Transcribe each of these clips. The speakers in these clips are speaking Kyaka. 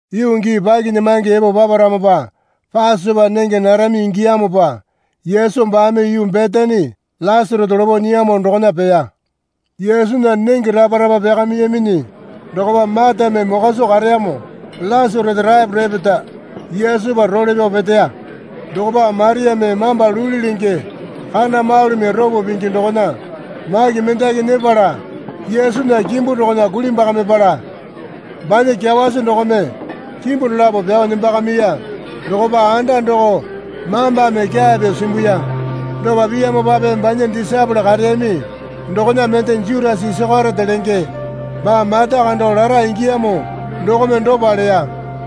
Yuu gii pakinyamange epo paparamopa Pasopa nenge narami ingiyamopa Yesu baame yuu Betani Lasarasa lopo nyiyamo dokona peya. Yesunya nenge rapa rapa pyakamiyaminyi dokopa Matame mokwa soo kareyamo Lasarasa taepo repeta Yesupa role pyao peteya. Dokopa Mariame mamba luli lenge kana malumi ropo pingi dokona maki mendaki nyepala Yesunya kimbu dokona kulimbwakamipala banya kyawasi dokome kimbu dolapo pyao nembakamiya. Dokopa anda doko mambame kyaa pyuo simbuya. Dopa piyamopape banya disaepole kareyami dokona mende Jutasa Isakeriote lenge baa mata kando lara ingiyamo dokome dopa leya.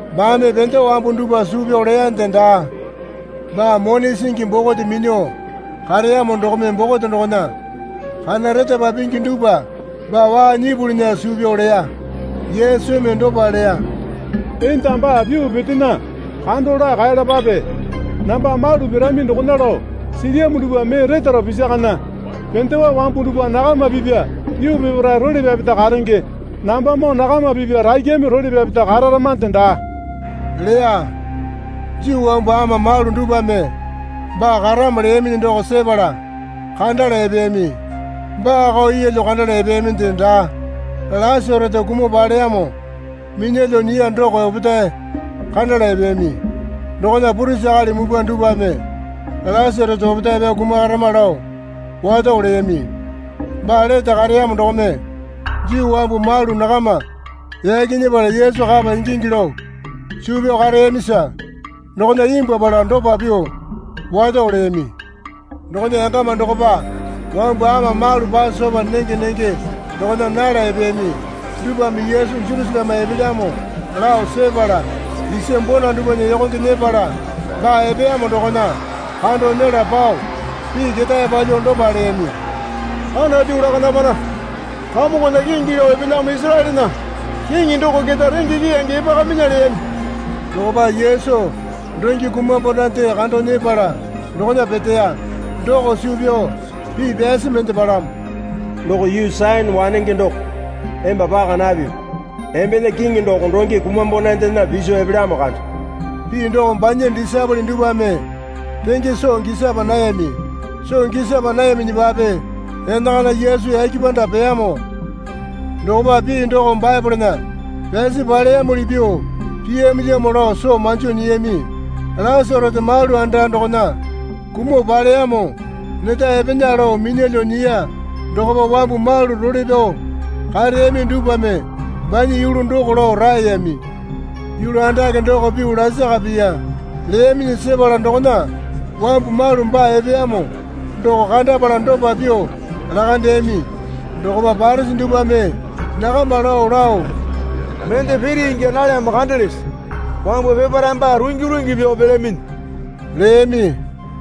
Baame pendewa wambu dupwa suu pyao leyande daa. Baa mone singi bokote minyuo kareyamo dokome bokote dokona kana retapa pingi dupwa baa waa nyipulinya suu pyao leya. Yesumi dopa leya. Enda baa pyuo petena, kando laa kaeyalapape. Namba malu pirami dokona lao silyamo dupwa mee retaro pisakana. Pendewa wambu dupwa nakama pipya yuu peparae role pyapeta karenge. Nambamoo nakama pipya rakyame role pyapeta kararamande daa leya. Juu wambu ama malu dupwame baa karamo leyaminyi doko sepala kandala epeyami. Baako yeelyo kandala epeyaminde daa, Lasarasa kumuo paleyamo minyalyuo nyiya doko opetae kandala epeyami. Dokona purisi akali mupwa dupwame Lasarasa opetae pyao kumakarama lao wato leyami. Baa lete kareyamo dokome Juu wambu malu nakama yaki nyepala Yesu kapa ingingi lao suu pyao kareyamisa dokona imbwuapala dopa pyuo wato leyami, Dokona yangama dokopa wambu ama malu Pasopa nenge nenge dokona nala epeyami dupwame Yesu Jerusaleme epelyamo lao sepala, isa bona dupwana yokonge nyepala baa epeyamo dokona kando nyela pao pii ketae palyuo dopa leyami. Anatu lakandamana. Kamongona kingi lao epelyamo Isaraelena Kiŋi doko keta renge keyange epakaminya leyami. Dokopa Yesu donge kumambonande kando nyepala dokona peteya. Doko suu pyao pii pyasi mende palamo. Doko yuu Sayone wanenge doko emba paka napipi. Embena Kiŋi doko donge kumambonandena piso epelyamo kande. Pii doko banya disaepole dupwame renge soo gisapa nayami. Soo gisapa nayaminyipape enakana Yesu yake panda peyamo dokopa pii doko Baepolena pyasi paleyamuli pyuo piyamilyamo lao soo manjo nyiyami. Lasarasa malu anda dokona kumuo paleyamo neta epena lao minyalyuo nyiya dokopa wambu malu role pyao kareyami dupwame banya yulu doko lao raeyami. Yulu andake doko pyuo lasaka piya leyaminyi sepala dokona wambu malu baa epeyamo doko kandapala dopa pyuo lakandeyami. Dokopa Parisi dupwame nakama lao lao, Mende piri ingya nalyamo kandelese? Wambu peparaeme baa rungi rungi pyao pelyaminyi leyami.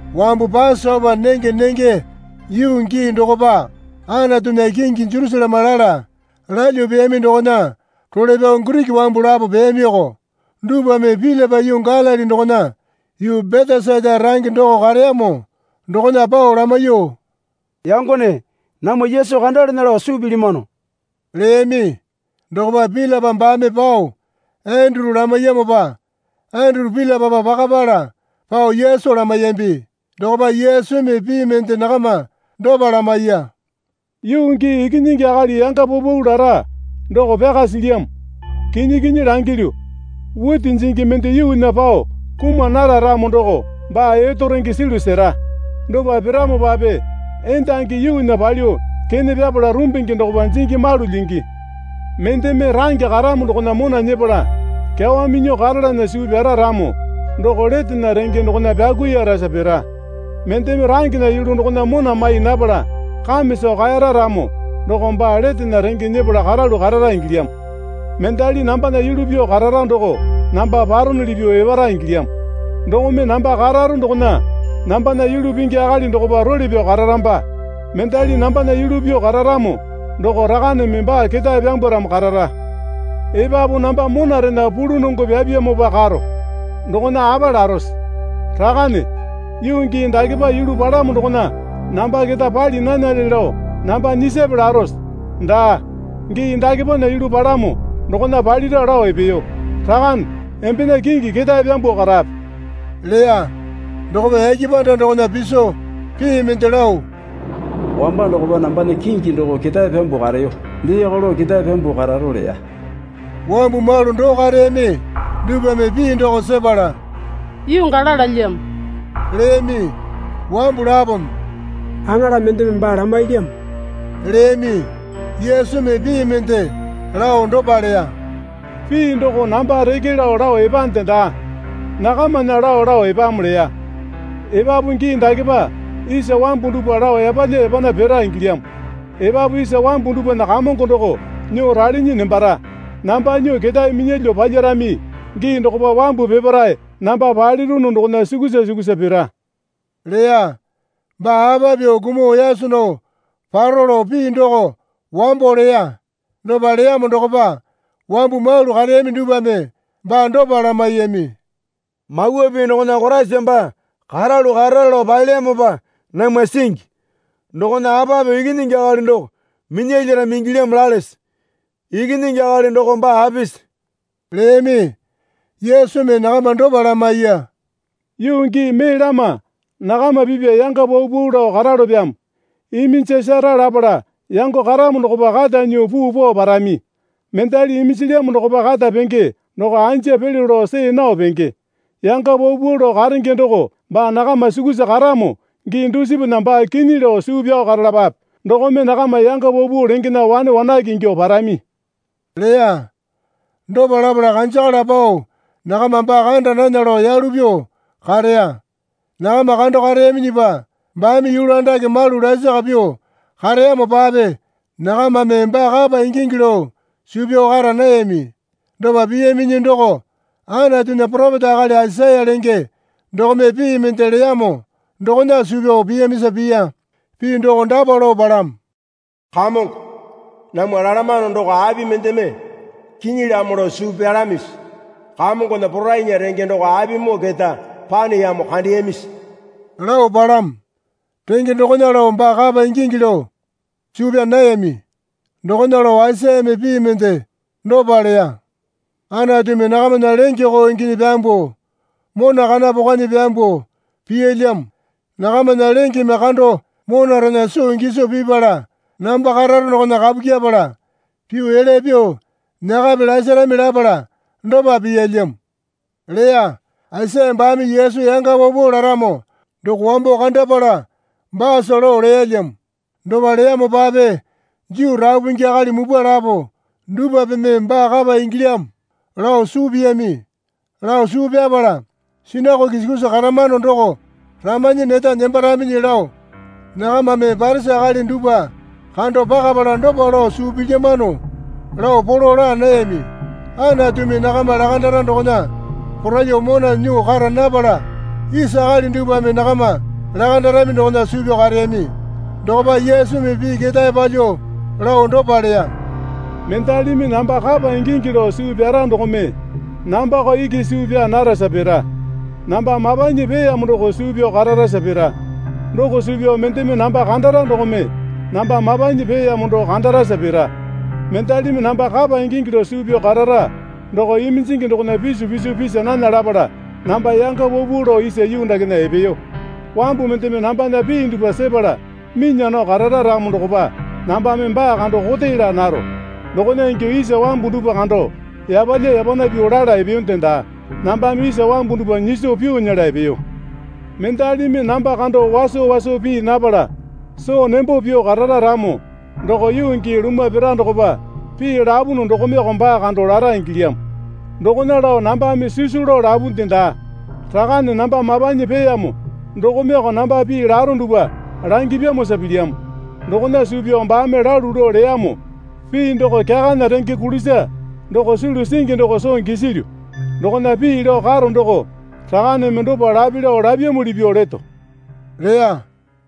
Wambu Pasopa nenge nenge yuu gii dokopa Anatunya kingi Jerusaleme lala lalyuo peyami dokona role pyao Giriki wambu lapo peyamioko. Dupwame Pilipa yuu Galili dokona yuu Betesaita range doko kareyamo dokona pao lamaiyuo, Yangone namwa Yesu kandalana lao suu pilyamano leyami. Dokopa Pilipa baame pao Enduru lamaiyamopa Enduru Pilipapa pakapala pao Yesu lamaiyambi. Dokopa Yesumi pii mende nakama dopa lamaiya. Yuu gii Ikinyingi Akali yanga paupau lara doko pyaka silyamo. Kinyi kinyi langilyu, witi jingi mende yuunya pao kuma nara ramo doko baa etorenge sulu sera. Dopa piramopape endangi yuunya palyuo kene pyapala rumbingi dokopa jingi malu lyingi. Mendeme range karamo dokona mona nyepala kyawa minyuo karalana suu pyara ramo doko letena renge dokona pyakuirasa pira. Mendeme rangena yulu dokona mona mai napala kame soo kaera ramo doko baa letena renge nyepala karalu karara ingilyamo. Mendali nambana yulu pyuo karara doko namba paronuli pyuo epara ingilyamo. Dokome namba karare dokona nambana yulu pingi akali dokopa role pyao kararamba. Mendali nambana yulu pyuo kararamo doko Rakaneme baa ketae pyambwaramo karara. Epapu namba monarena pulunongo pyapyamopa karo. Dokona apa larose? Rakane, yuu gii dakepa yulu palamo dokona namba keta pali nanale lao namba nyisape, larose? Daa, gii dakepana yulu palamo dokona palira lao epeyo. Rakane, embena kingi ketae pyambuo karape leya. Dokopa yake panda dokona piso pii mende lao, Wamba dokopa nambana kingi doko ketae pyambuo kareyo. Deeko lao ketae pyambuo kararo leya. Wambu malu doo kareyami dupwame pii doko sepala, Yuu gala lalyamo leyami. Wambu lapome, Aŋala mendeme baa lamailyamo, leyami. Yesumi pii mende lao dopa leya. Pii doko namba reke lao lao epande daa. Nakamana lao lao epamo leya. Epapu gii dakepa isa wambu dupwa lao yapalya yapana pira ingilyamo. Epapu isa wambu dupwana kamongo doko nyuo ralinyi nembara. Namba nyuo ketae minyalyuo palyarami gii dokopa wambu peparae namba palirunu dokona sukusa sukusa pira leya. (Baa apa pyuo kumuo yaso nao paro lao pii doko wambo leya.) Dopa leyamo dokopa wambu malu kareyami dupwame baa dopa lamaiyami. Mawa Pii dokona Koraisa baa karalu karara lao palelyamopa namwa singi. Dokona apa pyuo Ikinyingi Akali doko minyalyarami ingilyamo lalese? Ikinyingi Akali doko baa apisi? leyami. Yesumi nakama dopa lamaiya. Yuu gii mee lama nakama pipya yanga paupau lao karalopyamo. Iminjasara lapala yango karamo dokopa kata nyuo puu pao parami. Mendali iminjilyamo dokopa kata penge doko anja pelyo lao see nao penge. Yanga paupau lao karenge doko baa nakama sukusa karamo gii dusipana baa kinyi lao suu pyao karalapape. Dokome nakama yanga paupau lengena wane wanake ingyuo parami leya. Dopa lapala kanjakala pao nakama baa kanda nana lao yalu pyuo kareya. Nakama kando kareyaminyipa baame yulu andake malu lasaka pyuo kareyamopape nakamame baa kapa ingingi lao suu pyao kara nayami. Dopa piyaminyi doko Anatunya poropeta akali Aisaya lenge dokome pii mende leyamo dokona suu pyao piyamisa piya. Pii doko dapa lao palamo. Kamongo, namwa lalamano doko api mendeme kinyilyamo lao suu pyalamisi? Kamongona porainya renge doko apimoo keta paneyamo kandeyamisi? lao palamo. Renge dokona lao baa kapa ingingi lao suu pyaa nayami. Dokona lao Aisayame pii mende dopa leya. Anatumi nakamana lenge koo inginyi pyambuo, mona kana pokwanyi pyambuo piyalyamo. Nakamana lengeme kando monarena soo giso pipala namba kararo dokona kapu kyepala pyuo elya pyuo nyakape lasarami lapala dopa piyalyamo, leya. Aisaya baame Yesu yanga paupau laramo doko wambo kandapala baasa lao leyalyamo. Dopa leyamopape Juu rapu pingi akali mupwa lapo dupwapeme baa kapa ingilyamo lao suu piyami. Lao suu pyapala sinakoke sukusa karamano doko ramanyi neta nembaraminyi lao nakamame Parisi akali dupwa kando pakapala dopa lao suu pilyamano lao polo laa nayami. Anatumi nakama lakandara dokona poraiyuo mona nyuo kara napala isa akali dupwame nakama lakandarami dokona suu pyao kareyami. Dokopa Yesumi pii ketae palyuo lao dopa leya. Mendalimi namba kapa ingingi lao suu pyara dokome nambako iki suu pyaa narasa pira. Namba mapanyi peeyamo doko suu pyao kararasa pira. Doko suu pyao mendeme namba kandara dokome namba mapanyi peeyamo doo kandarasa pira. Mendalimi namba kapa ingingi lao suu pyao karara doko iminjingi dokona pisu piso pisa nana lapala namba yanga paupau lao isa yuu dakena epeyo. Wambu mendeme nambana pii dupwa sepala minya nao karara ramo dokopa nambame baa kando kote laa naro. Dokona ingyuo isa wambu dupwa kando yapalya yapana pyuo lala epeyonde daa. Nambame isa wambu dupwa nyiso pyuo nyela epeyo. Mendalimi namba kando waso waso pii napala soo nembo pyuo karara ramo doko yuu gii lumwa pira dokopa pii lapunu dokomeko baa kando lara ingilyamo. Dokona lao nambame sisu lao lapunde daa. Rakane namba mapanyi peeyamo dokomeko namba pii laro dupwa langipyamosa pilyamo. Dokona suu pyao baame lalu lao leyamo pii doko kyakana renge kulisa doko sulu singi doko soo gisilyu. Dokona pii lao karo doko Rakaneme dopa lape lao lapyamuli pyuo leto leya.